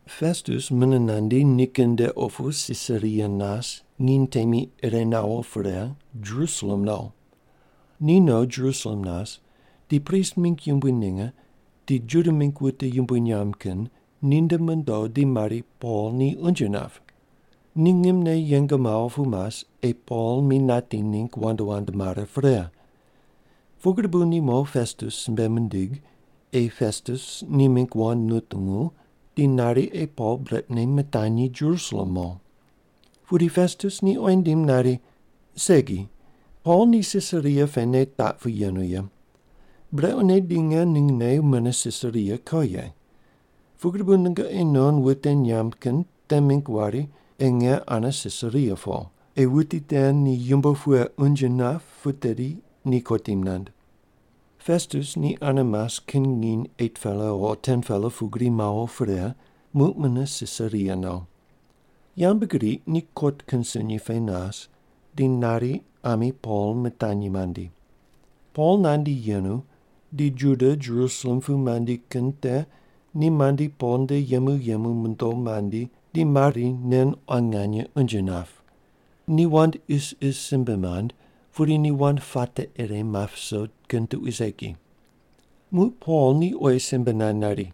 Pestus mune nandi nikin nde opu Sisaria nas nginy temi ire nawo pre, Jerusalem no. Ni no Jerusalem nas di prist mingg yumbui ninge di Juda mingg wute yumbui nyamb kin ninde mondo di mari Pol ni unje nap. Ni ngimne yeng mawo pu mas ei Pol mi nati ningg wand wand mare pre. Pugri bu ni mo Pestus simbe mindig, ei Pestus ni mingg wand nutungu di nari ei Pol brequne mitanyi Jerusalem mo. Pudi Pestus ni oyi nindim nari, “Segi, Pol ni Sisaria pene taq pu yenu ye. Brequne di nge ningne mune Sisaria ko ye. Pugri bu nungoqi non wute nyamb kin te mingg wari ei nge ane Sisaria po, ei wuti te ni yumbo pughe unje nap pu tedi ni kotim maind.” Pestus ni ane mas kin nginy 8-pela o 10-pela pugri mawo pre, muq mune Sisaria no. Yambgriq ni kot kin sunyi pe nas, di nari ami Pol mitanyi mandi. Pol nandi yenu di Juda Jerusalem pu mandi kin te ni mandi Pol nde yemu yemu mondo mandi di mari wuti nen quan nganye unje nap. Ni wand isis simbe mand pudi ni wand puate ire map viso kin tuqui segi. Muq Pol ni oyi simbe nand nari,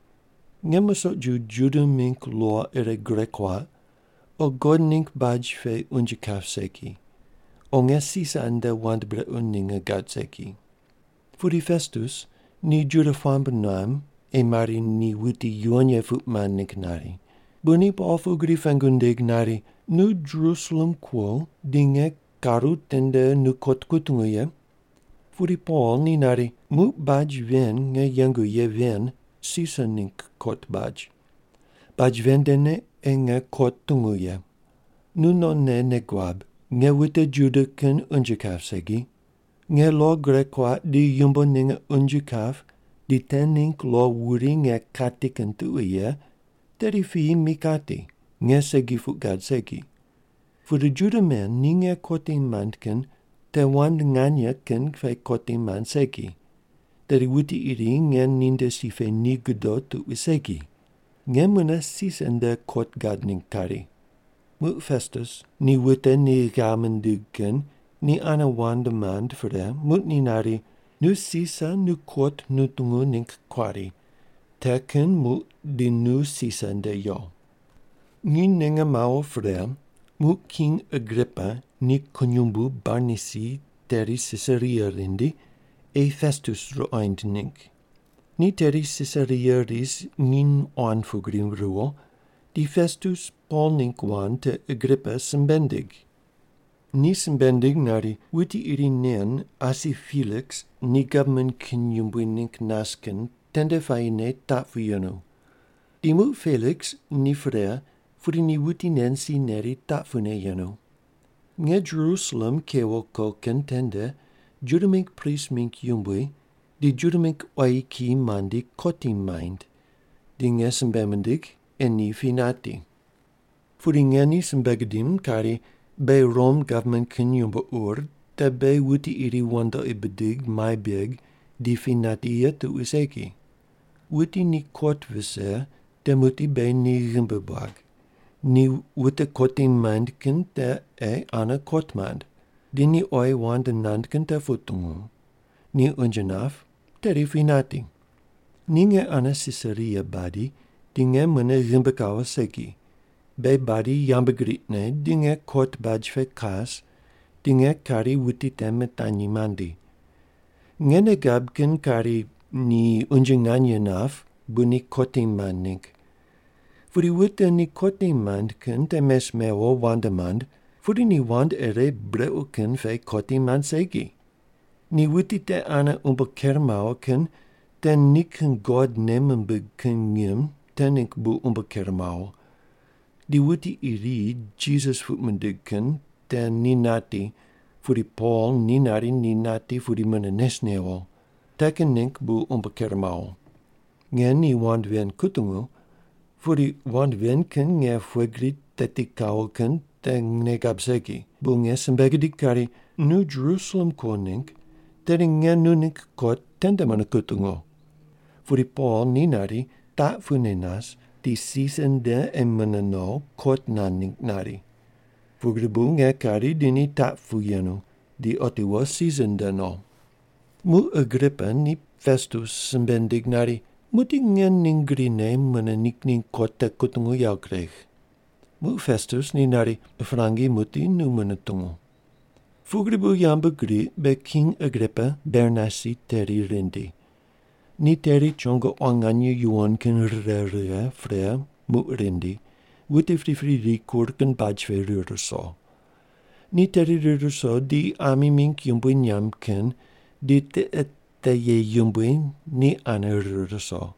“Nge musoq ju Juda mingg lo ire gure kuaq o God ningg baj pe unje kap segi, o nge Sisar nde wand brequ ninge gad segi.” Pudi Pestus ni Juda puamb nuam ei mari ni wuti yuwon ye puq mand ningg nari, bu ni Pol pugri pengu nindig nari, “Nu Jerusalem kuo di nge karu tende nu kot kutungu ye?” Pudi Pol ni nari, “Muq baj ven nge yengu ye ven Sisar ningg kot baj. Baj ven ndene ei nge kot tungu ye. Nu nonne nei guab, nge wute Juda kin unje kap segi. Nge lo gure kuaq di yumbo ninge unje kap di te ningg lo wuri nge kati kin tuqui ye, tedi piyi mi kati, nge segi puq gad segi. Pudi Juda men ni nge kotim maind kin te wand nganye kin pe kotim maind segi, tedi wuti iri nge ninde si pe ni godo tuqui segi. Nge mune Sisar nde kot gad ningg kari.” Muq Pestus ni wute ni ghav mindig kin ni ane wand mand pre, muq ni nari, “Nu Sisar nu kot nutungu ningg kuari, te kin muq di nu Sisar nde yo.” Nginy ninge mawo pre, muq King Agripa ni kunyumbu Bernaisi teri Sisaria rindi, ei Pestus ruqoind ningg. Ni teri Sisaria ris nginy quan pugri ruwo, di Pestus Pol ningg wand te Agripa simbe nindig. Ni simbe nindig nari, “Wuti iri nen asi Peliks ni gavman kin yumbui ningg nas kin tende puayine taq pu yenu. Di muq Peliks ni pre pudi ni wuti nen si neri taq pune yenu. Nge Jerusalem kewo ko kin tende Juda mingg prist mingg yumbui di Juda mingg quayi kiyi mandi kotim maind, di nge simbe mindigh ei ni pi nati. “Pudi nge ni simbe gidim kari, beghi Rom gavman kin yumbo ur te beghi wuti iri wandoqi bidig mai beg di pi nati ye tuqui segi. Wuti ni kot vise te muqdi beghi ni ghimbi buag, ni wute kotim maind kin te ei ane kot mand, di ni oyi wand nand kin te putungu, ni unje nap, tedi pi nati. “Ni nge ane Sisaria badi, di nge mune ghimbi kawo segi, beghi badi yambgriqne di nge kot baj pe kas, di nge kari wuti te mitanyi mandi. Nge nei gab kin kari ni unje nganye nap bu ni kotim maind ningg, pudi wute ni kotim maind kin te mes mewo wand mand, pudi ni wand ire brequ kin pe kotim maind segi. Ni wuti te ane umbo ker mawo kin te nikin God nei mimbig kin ngim te ningg bu umbo ker mawo, di wuti iri Jisas puq mindig kin te ni nati, pudi Pol ni nari ni nati, pudi mune nes newo. Te kin ningg bu umbo ker mawo. Nge ni wand ven kutungu pudi wand ven kin nge pughe gri teti kawo kin te nei gab segi, bu nge simbe gidig kari, ‘Nu Jerusalem kuo ningg, tedi nge nu ningg kot tende mune kutungu.’ Pudi Pol ni nari, taq pune nas di Sisar nde ei mune no kot nand ningg nari. Pugri bu nge kari di ni taq pu yenu, di otiwo Sisar nde no.” Muq Agripa ni Pestus simbe nindig nari, “Muqdi nge ning grine mune ni ningg kot te kutungu yawo kuregh.” Muq Pestus ni nari, “Prangi muqdi nu mune tungu.” Pugri bu yambgriq be King Agripa Bernaisi teri rindi. Ni teri chongo quan nganye yuwon kin rire righe pre muq rindi, wute pripri rikur kin baj pe rir ruso. Ni teri rir ruso di ami mingg yumbui nyamb kin di tiqe te ye yumbui ni ane rir ruso.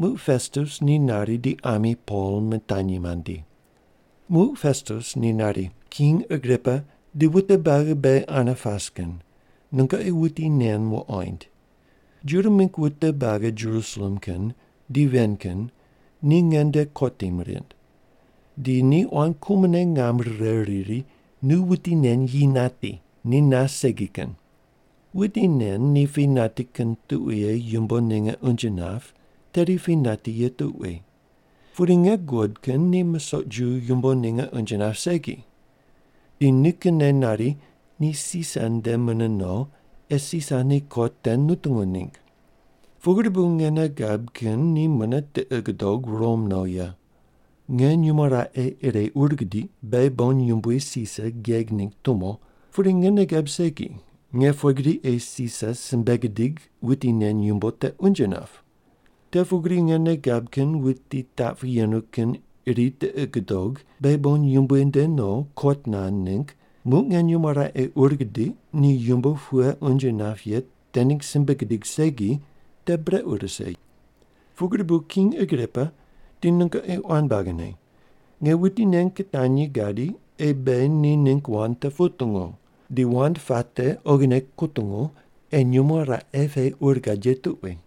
Muq Pestus ni nari di ami Pol mitanyi mandi. Muq Pestus ni nari, “King Agripa di wute buagi beghi ane pas kin nungoqi wuti nen wuqoind. Juda mingg wute buagi Jerusalem kin di ven kin ni nge nde kotim rind. Di ni quan kumone ngam rire riri, ‘Nu wuti nen yi nati. Ni nas segi kin.’ Wuti nen ni pi nati kin tuqui ye yumbo ninge unje nap tedi pi nati ye tuqui. Pudi nge guqod kin ni musoq ju yumbo ninge unje nap segi. Di nikinne nari, ni Sisar nde mune no ei Sisar ni kot te nutungu ningg. Pugri bu nge nei gab kin ni mune tiqi gudog Rom no ye. Nge nyumo raqe ire ur gidiq beghi bon yumbui Sisar geg ningg tumo, pudi nge nei gab segi nge pughe gri ei Sisar simbe gidig wuti nen yumbo te unje nap. Te pugri nge nei gab kin wuti taq pu yenu kin iri tiqi gudog beghi bon yumbui nde no kot nand ningg muq nge nyumo raqe ur gidiq ni yumbo pughe unje nap ye te ningg simbe gidig segi te brequ rise. Pugri bu King Agripa di nungoqi quan buagine, nge wuti nen kitanyi gadi ei beghi ni ningg wand te putungu, di wand puate oghine kutungu ei nyumo raqe pe ur gad ye tuqui.”